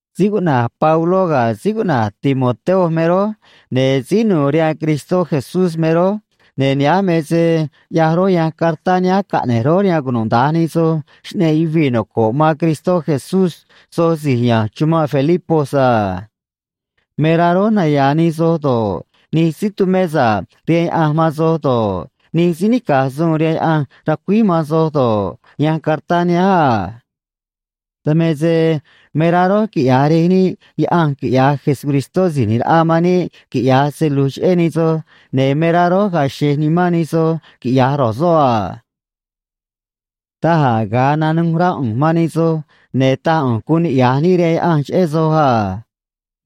Síí cuꞌna̱j Pabló ga̱ síí cuꞌna̱j Timoteo me rój, ne̱ síí nu̱u̱ rihaan Cristó Jesús me rój, ne̱ nihánj me se ꞌyaj rój yanj cartá nihánj caꞌne̱j rój rihaan cunuda̱nj nij soj xꞌneꞌ yuvii̱ noco̱ꞌ man Cristó Jesús soj si̱j ya̱nj chumanꞌ Filipos a. Me rá rój naya̱a̱ nij soj do̱ꞌ, nij síí tumé sa̱ꞌ rihaan Yaꞌanj man soj do̱ꞌ, nij síí nica̱j suun rihaan Yaꞌanj ra̱cuíj man soj do̱ꞌ, yanj cartá nihánj a. Dan me se me rá rój quiꞌya̱j Rej níꞌ Yaꞌanj quiꞌya̱j Jesucristó Si̱j ꞌNi̱j Raꞌa man níꞌ quiꞌya̱j se lu̱j cheꞌé nij soj, ne̱ me rá rój ga̱a̱ xe̱j nimán nij soj quiꞌya̱j ro̱j soꞌ a. Daj a̱ ga̱a nanuj rá ꞌu̱nj man nij soj, ne̱ taj ꞌu̱nj guun niꞌya̱j níꞌ rihaan Yaꞌanj cheꞌé soj a.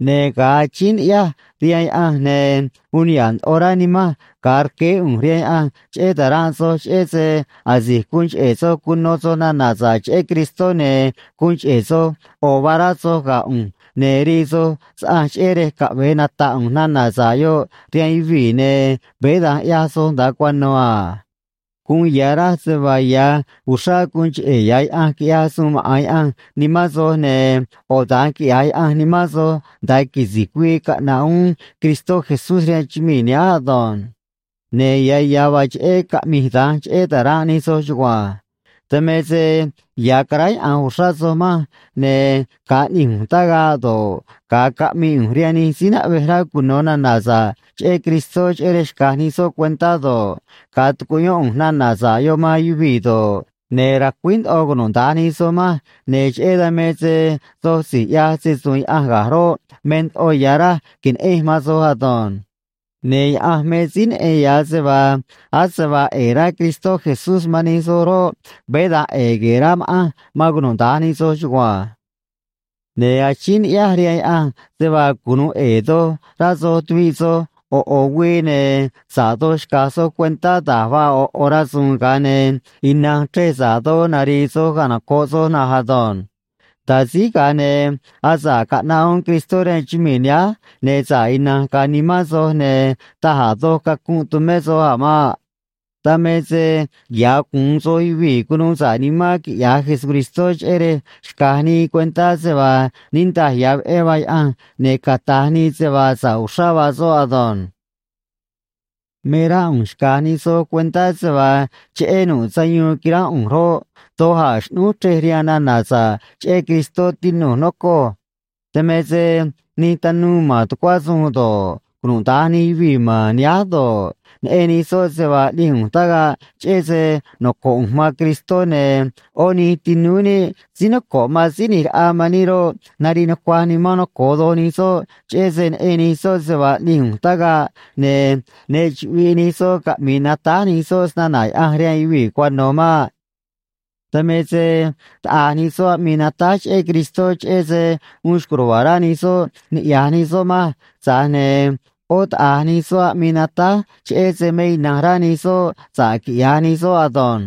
Ne̱ ga̱a achíín ni̱ꞌyáj rihaan Yaꞌanj, ne̱ uun niha̱ꞌ ndoꞌo rá nimanj ga̱a rqueé ꞌu̱nj rihaan Yaꞌanj cheꞌé ta̱ranꞌ soj cheꞌé se asi̱j guun cheꞌe̱ soj cuno soj nana̱ sa̱ꞌ cheꞌé Cristó, ne̱ guun cheꞌe̱ soj ꞌo̱ vaa rá soj ga̱ ꞌu̱nj ne̱ rii soj saꞌanj cheꞌé rej caꞌve̱e nataꞌ ꞌu̱nj nana̱ sa̱ꞌ yoꞌ rihaan yuvii̱, ne̱ veé da̱nj ꞌyaj soj nda̱a cuano̱ a. Guun ya̱ raj se vaa ya̱ uxrá guun cheꞌe̱ ya̱ Yaꞌanj quiꞌyaj suun maꞌa̱n Yaꞌanj nimán soj, ne̱ ꞌo̱ da̱nj quiꞌya̱j Yaꞌanj nimán soj nda̱a quisi̱j güii caꞌna̱ꞌ uún Cristó Jesús rihaan chumii̱ nihánj ado̱nj. Ne̱ ya̱ ya̱ vaa cheꞌé caꞌmij da̱nj cheꞌé ta̱ranꞌ nij soj chugua̱nj. Dan me se ya̱ caráyaꞌa̱nj uxrá soj manj, ne̱ ga̱a ꞌni̱j ꞌu̱nj tagaꞌ do̱ꞌ, ga̱a caꞌmii ꞌu̱nj rihaan nij síí naꞌvej rá cuno̱ nana̱ sa̱ꞌ cheꞌé Cristó cheꞌé rej xca̱j nij soꞌ cuentá do̱ꞌ, ga̱a tucuꞌyón ꞌu̱nj nana̱ sa̱ꞌ yoꞌ man yuvii̱ do̱ꞌ, ne̱ racuíj ndoꞌo cunuda̱nj nij soj manj, ne̱ cheꞌé dan me se soj si̱j ꞌyaj se‑su̱u̱n Yaꞌanj ga̱j roꞌ, me ndoꞌo ya̱ raj que̱neꞌenj man soj ado̱nj. Ne̱ Yaꞌanj me síí neꞌen ya̱ se vaa ase vaa ꞌe̱e̱ rá Cristó Jesús man nij soj roꞌ, veé da̱nj ꞌe̱e̱ gue̱e̱ rá ma̱ꞌanj man cunuda̱nj nij soj chugua̱nj. Ne̱ achíín ni̱ꞌyáj rihaan Yaꞌanj se vaa cunu̱u ꞌe̱e̱ doj rá soj tuviꞌ soj ꞌo̱ ꞌo̱ güii, ne̱ sa̱ꞌ doj xca̱j soj cuentá da̱j vaa ꞌo̱ ꞌo̱ rasu̱u̱n, ga̱a ne̱ ina̱nj chrej sa̱ꞌ doj nari̱i̱ soj canoco̱ꞌ soj na̱nj ado̱nj. Nda̱a síj, ga̱a ne̱ asa̱ꞌ caꞌnaꞌ uún Cristó rihaan chumii̱ nihánj, ne̱ sa̱ꞌ ina̱nj ga̱a̱ nimán soj, ne̱ taj a̱ doj cacunꞌ tu̱mé soj a̱ maꞌ. Dan me se ya̱ gu̱un soj yuvii̱ cunuu sa̱ꞌ nimán quiꞌya̱j Jesucristó, cheꞌé rej xca̱j nii cuentá se vaa niꞌndaj ya̱ veꞌé vaa Yaꞌanj ne̱ cata̱j nii se vaa sa̱ꞌ uxrá vaa soꞌ ado̱nj. Me rá ꞌu̱nj xca̱j nij soj cuentá se vaa cheꞌé nu̱ꞌ sayuun quiránꞌ ꞌu̱nj roꞌ, doj a̱ xꞌnúj chrej rihaan nana̱ sa̱ꞌ cheꞌé Cristó, tinu̱j, nocoj. Dan me se nij tanuu ma̱n tucuá suun do̱ꞌ, cunuda̱nj nij yuvii̱ ma̱n nihánj do̱ꞌ, neꞌen nij soꞌ se vaa ꞌni̱j ꞌu̱nj tagaꞌ cheꞌé se noco̱ꞌ ꞌu̱nj man Cristó, ne̱ ꞌó nij tinúú níꞌ síí noco̱ꞌ man Síí ꞌNi̱j Raꞌa man níꞌ roꞌ, nariꞌ nucuaj nimán noco̱o doj nij soꞌ, cheꞌé se neꞌen nij soꞌ se vaa ꞌni̱j ꞌu̱nj tagaꞌ, ne̱ ne chuꞌviꞌ nij soꞌ caꞌmi̱i̱ natáj nij soꞌ snana̱ Yaꞌanj rihaan yuvii̱ cuano̱ maꞌ. Dan me se, taꞌa̱j nij soꞌ aꞌmii natáj cheꞌé Cristó cheꞌé se uun xco̱j ruva̱a̱ rá nij soꞌ niꞌya̱j nij soꞌ manj, tza̱j ne̱ ꞌó taꞌa̱j nij soꞌ aꞌmii natáj cheꞌé se me ina̱nj rá nij soꞌ sa̱ꞌ quiꞌya̱j nij soꞌ ado̱nj.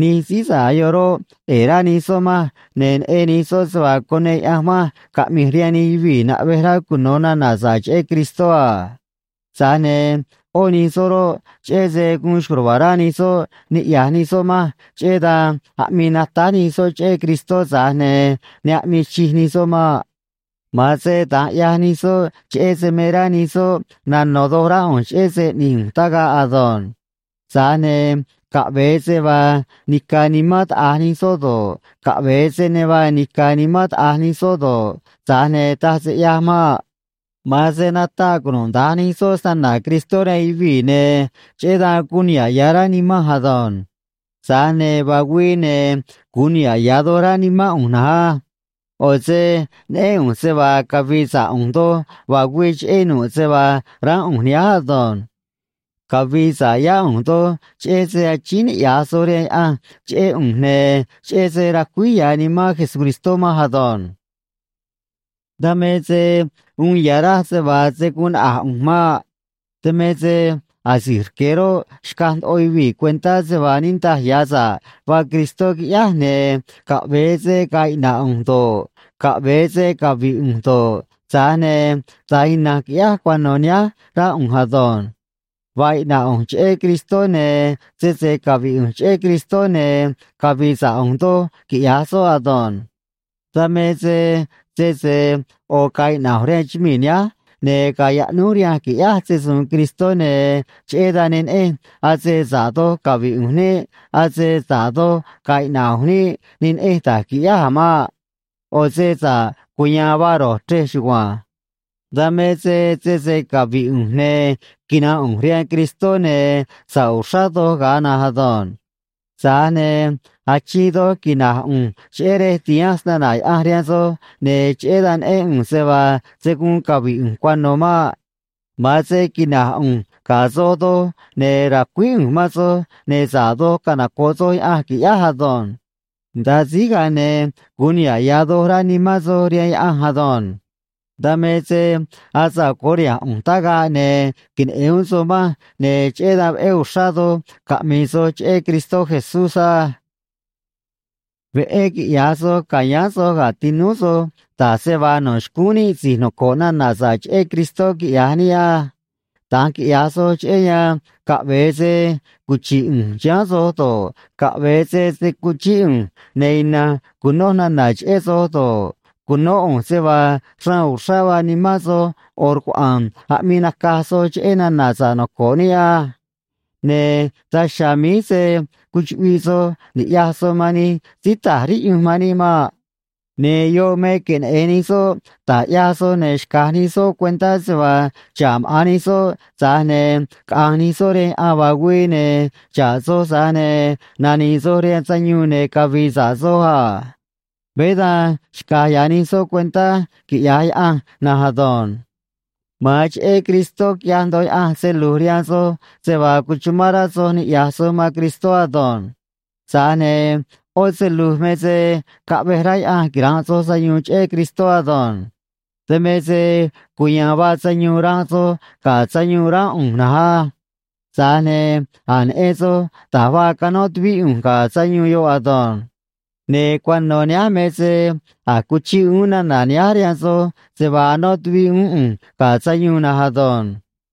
Nij síí sa̱ꞌ yoꞌ roꞌ, ꞌe̱e̱ rá nij soꞌ manj, ne̱ neꞌen nij soꞌ se vaa cuneꞌ Yaꞌanj manj caꞌmi̱j rihaan nij yuvii̱ naꞌvej rá cuno̱ nana̱ sa̱ꞌ cheꞌé Cristó a. Tza̱j ne̱ ꞌó nij soꞌ roꞌ, cheꞌé se guun xco̱j ruva̱a̱ rá nij soꞌ niꞌya̱j nij soꞌ manj, cheꞌé dan aꞌmii natáj nij soꞌ cheꞌé Cristó, tza̱j ne̱ ne aꞌmii chij nij soꞌ maꞌ. Ma̱an se da̱nj ꞌyaj nij soꞌ cheꞌé se me rá nij soꞌ nano̱ doj rá ꞌu̱nj cheꞌé se ꞌni̱j ꞌu̱nj tagaꞌ ado̱nj. Tza̱j ne̱ caꞌve̱e se vaa nica̱ nimán taꞌa̱j nij soꞌ do̱ꞌ, caꞌve̱e se ne vaa nica̱ nimán taꞌa̱j nij soꞌ do̱ꞌ, tza̱j ne̱ taj se ꞌyaj maꞌ. Ma̱an se nataꞌ cunuda̱nj nij soꞌ snana̱ Cristó rihaan yuvii̱, ne̱ cheꞌé dan guun niha̱ꞌ ya̱ rá nimanj ado̱nj. Tza̱j ne̱ vaa güii, ne̱ gu̱un niha̱ꞌ ya̱ doj rá nimán ꞌu̱nj na̱nj á. ꞌO̱ se neꞌén ꞌu̱nj se vaa cavi̱i̱ sa̱ꞌ ꞌu̱nj doj vaa güii, cheꞌé nu̱ꞌ se vaa ránꞌ ꞌu̱nj nihánj ado̱nj. Cavi̱i̱ sa̱ꞌ yá ꞌu̱nj doj cheꞌé se achíín niꞌya̱j soj rihaan Yaꞌanj cheꞌé ꞌu̱nj, ne̱ cheꞌé se racuíj ya̱ Nimán Jesucristó manj ado̱nj. Dan me se uun ya̱ raj se vaa se̱ guun naꞌa̱j ꞌu̱nj maꞌ. Dan me se asi̱j rque̱ roꞌ, xcaj ndoꞌo yuvii̱ cuentá se vaa niꞌndaj ya̱ sa̱ꞌ vaa Cristó, quiꞌyáj, ne̱ caꞌve̱e se ga̱a̱ iꞌna̱ꞌ ꞌu̱nj do̱ꞌ, caꞌve̱e se cavi̱ꞌ ꞌu̱nj do̱ꞌ, tza̱j ne̱ da̱nj ina̱nj qui̱ꞌyáj cuano̱ nihánj, rá ꞌu̱nj ado̱nj. Vaa iꞌna̱ꞌ ꞌu̱nj cheꞌé Cristó, ne̱ sese cavi̱ꞌ ꞌu̱nj cheꞌé Cristó, ne̱ cavi̱i̱ sa̱ꞌ ꞌu̱nj doj, quiꞌya̱j soꞌ ado̱nj. Dan me se sese ꞌo̱ ga̱a̱ iꞌna̱ꞌ ꞌu̱nj rihaan chumii̱ nihánj, ne̱ ga̱a̱ yaꞌnúj rihanj qui̱ꞌyáj se‑su̱u̱n Cristó, ne̱ cheꞌé dan ne neꞌenj ase sa̱ꞌ doj cavi̱ꞌ ꞌu̱nj niꞌ, ase sa̱ꞌ doj ga̱a̱ iꞌna̱ꞌ ꞌu̱nj niꞌ, ne neꞌenj da̱j qui̱ꞌyáj a̱ maꞌ. ꞌO̱ se sa̱ꞌ cuya̱a̱n vaa ro̱j chrej chugua̱nj. Dan me se sese cavi̱ꞌ ꞌu̱nj, ne̱ quina̱nꞌ ꞌu̱nj rihaan Cristó, ne̱ sa̱ꞌ uxrá doj ga̱a̱ na̱nj ado̱nj. Tza̱j ne̱ achiin doj quina̱j ꞌu̱nj cheꞌé rej ti̱hanj snana̱ Yaꞌanj rihaan soj, ne̱ cheꞌé dan neꞌén ꞌu̱nj se vaa se̱ guun cavi̱ꞌ ꞌu̱nj cuano̱ maꞌ. Ma̱an se quina̱j ꞌu̱nj ga̱ soj doj, ne̱ ra̱cuíj ꞌu̱nj man soj, ne̱ sa̱ꞌ doj canoco̱ꞌ soj Yaꞌanj, qui̱ꞌyáj ado̱nj. Nda̱a síj, ga̱a ne̱ gu̱un niha̱ꞌ ya̱ doj rá nimán soj rihaan Yaꞌanj ado̱nj. Dan me se asa̱ꞌ curiha̱nj ꞌu̱nj tagaꞌ, ne̱ queneꞌe̱n uún soj manj, ne̱ cheꞌé dan veꞌé uxrá doj caꞌmi̱i̱ soj cheꞌé Cristó Jesús á. Veꞌé quiꞌya̱j soj ca̱yáán soj ga̱ tinúú soj, da̱j se vaa no̱ xcúún níꞌ si̱j noco̱ꞌ nana̱ sa̱ꞌ cheꞌé Cristó quiꞌya̱j níꞌ á. Da̱nj quiꞌya̱j soꞌ cheꞌé yan, caꞌve̱e se cuchi̱ꞌ ꞌu̱nj chiháán soj do̱ꞌ, caꞌve̱e se se̱ cuchíꞌ ꞌu̱nj ne̱ ina̱nj cu̱noj nana̱ cheꞌé soj do̱ꞌ, cu̱nó ꞌu̱nj se vaa xraan uxrá vaa nimán soj ꞌo̱ rcuaꞌa̱a̱n aꞌmii nacaj soj cheꞌé nana̱ sa̱ꞌ noco̱ꞌ níꞌ á. Ne̱ daj chiha̱a̱ míj se̱ cuchuꞌviꞌ soj ni̱ꞌyaj soj man nij síí ta̱j riꞌyunj man níꞌ maꞌ. Ne̱ yoꞌ me queneꞌe̱n nij soꞌ da̱j ꞌyaj soj, ne̱ xca̱j nij soꞌ cuentá se vaa xa̱ꞌ maꞌa̱n nij soꞌ, tza̱j ne̱ caꞌa̱nj nij soꞌ rihaan yaꞌan vaa güii, ne̱ xa̱ꞌ soj, tza̱j ne̱ nani̱i̱ soj rihaan sayuun ne̱ cavi̱i̱ sa̱ꞌ soj a. Veé da̱nj xca̱j ya̱ nij soꞌ cuentá, quiꞌya̱j Yaꞌanj na̱nj ado̱nj. Ma̱an cheꞌé Cristó quiꞌyaj ndoꞌo Yaꞌanj se lu̱j rihaan soj se vaa cuchumán rá soj niꞌya̱j soj man Cristó ado̱nj. Tza̱j ne̱ ꞌó se lu̱j me se caꞌvej rá Yaꞌanj quira̱nꞌ soj sayuun cheꞌé Cristó ado̱nj. Dan me se cuya̱a̱n vaa sayuun ranꞌ soj ga̱ sayuun ránꞌ ꞌu̱nj na̱nj á. Tza̱j ne̱ a̱j neꞌen soj da̱j vaa canó tuvíꞌ ꞌu̱nj ga̱ sayuun yoꞌ ado̱nj. Ne̱ cuano̱ nihánj me se a̱j cuchiꞌ uún nana̱ nihánj rihaan soj se vaa anó tuviꞌ uún ꞌu̱nj ga̱ sayuun na̱nj ado̱nj.